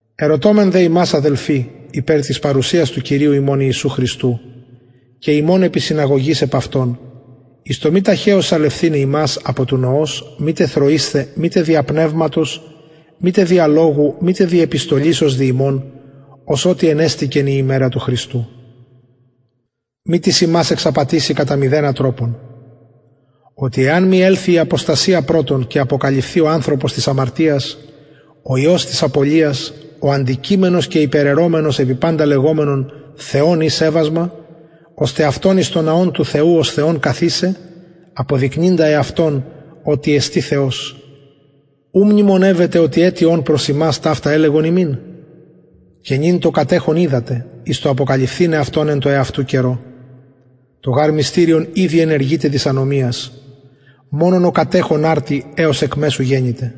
ερωτωμεν δε υμας αδελφοι υπερ της παρουσιας του κυριου ημων ιησου χριστου και ημων επισυναγωγης επ αυτον εις το μη ταχεως σαλευθηναι υμας απο του νοος μητε θροεισθαι μητε δια πνευματος μητε δια λογου μητε δι επιστολης ως δι ημων ως οτι ενεστηκεν η ημερα του χριστου μη τις υμας εξαπατηση κατα μηδενα τροπον οτι εαν μη ελθη η αποστασια πρωτον και αποκαλυφθη ο ανθρωπος της αμαρτιας ο υιος της απωλειας ο αντικειμενος και υπεραιρομενος επι παντα λεγομενον θεον η σεβασμα ωστε αυτον εις τον ναον του θεου ως θεον καθισαι αποδεικνυντα εαυτον οτι εστιν θεος ου μνημονευετε οτι ετι ων προς υμας ταυτα ελεγον υμιν και νυν το κατεχον οιδατε εις το αποκαλυφθηναι αυτον εν τω εαυτου καιρω το γαρ μυστηριον ηδη ενεργειται της ανομιας μονον ο κατεχων αρτι εως εκ μεσου γενηται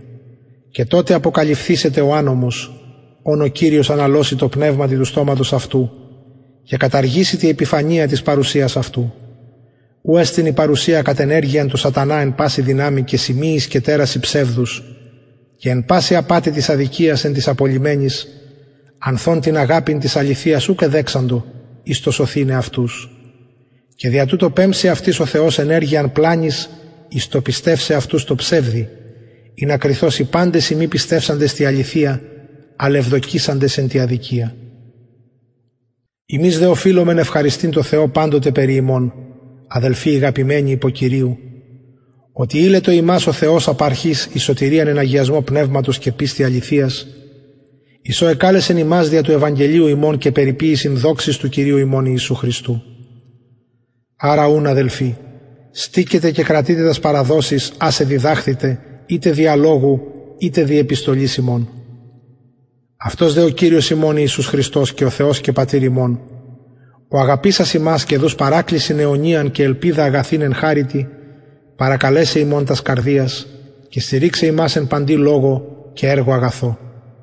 και τοτε αποκαλυφθησεται ο ανομος ον ο κυριος αναλωσει τω πνευματι του στοματος αυτου και καταργησει τη επιφανεια της παρουσιας αυτου ου εστιν η παρουσια κατ ενεργειαν του σατανα εν παση δυναμει και σημειοις και τερασιν ψευδους και εν παση απατη της αδικιας εν τοις απολλυμενοις ανθ ων την αγαπην της αληθειας ουκ εδεξαντο εις το σωθηναι αυτους και δια τουτο πεμψει αυτοις ο θεος ενεργειαν πλανης εις το πιστευσαι αυτους τω ψευδει ινα κριθωσιν παντες οι μη πιστευσαντες τη αληθεια αλλ ευδοκησαντες εν τη αδικια ημεις δε οφειλομεν ευχαριστειν τω θεω παντοτε περι υμων αδελφοι ηγαπημενοι υπο κυριου οτι ειλετο υμας ο θεος απ αρχης εις σωτηριαν εν αγιασμω πνευματος και πιστει αληθειας εις ο εκαλεσεν υμας δια του ευαγγελιου ημων εις περιποιησιν δοξης του κυριου ημων ιησου χριστου αρα ουν αδελφοι στηκετε και κρατειτε τας παραδοσεις ας εδιδαχθητε ειτε δια λογου ειτε δι επιστολης ημων αυτος δε ο κυριος ημων ιησους χριστος και ο θεος και πατηρ ημων ο αγαπησας ημας και δους παρακλησιν αιωνιαν και ελπιδα αγαθην εν χαριτι παρακαλεσαι υμων τας καρδιας και στηριξαι υμας εν παντι λογω και εργω αγαθω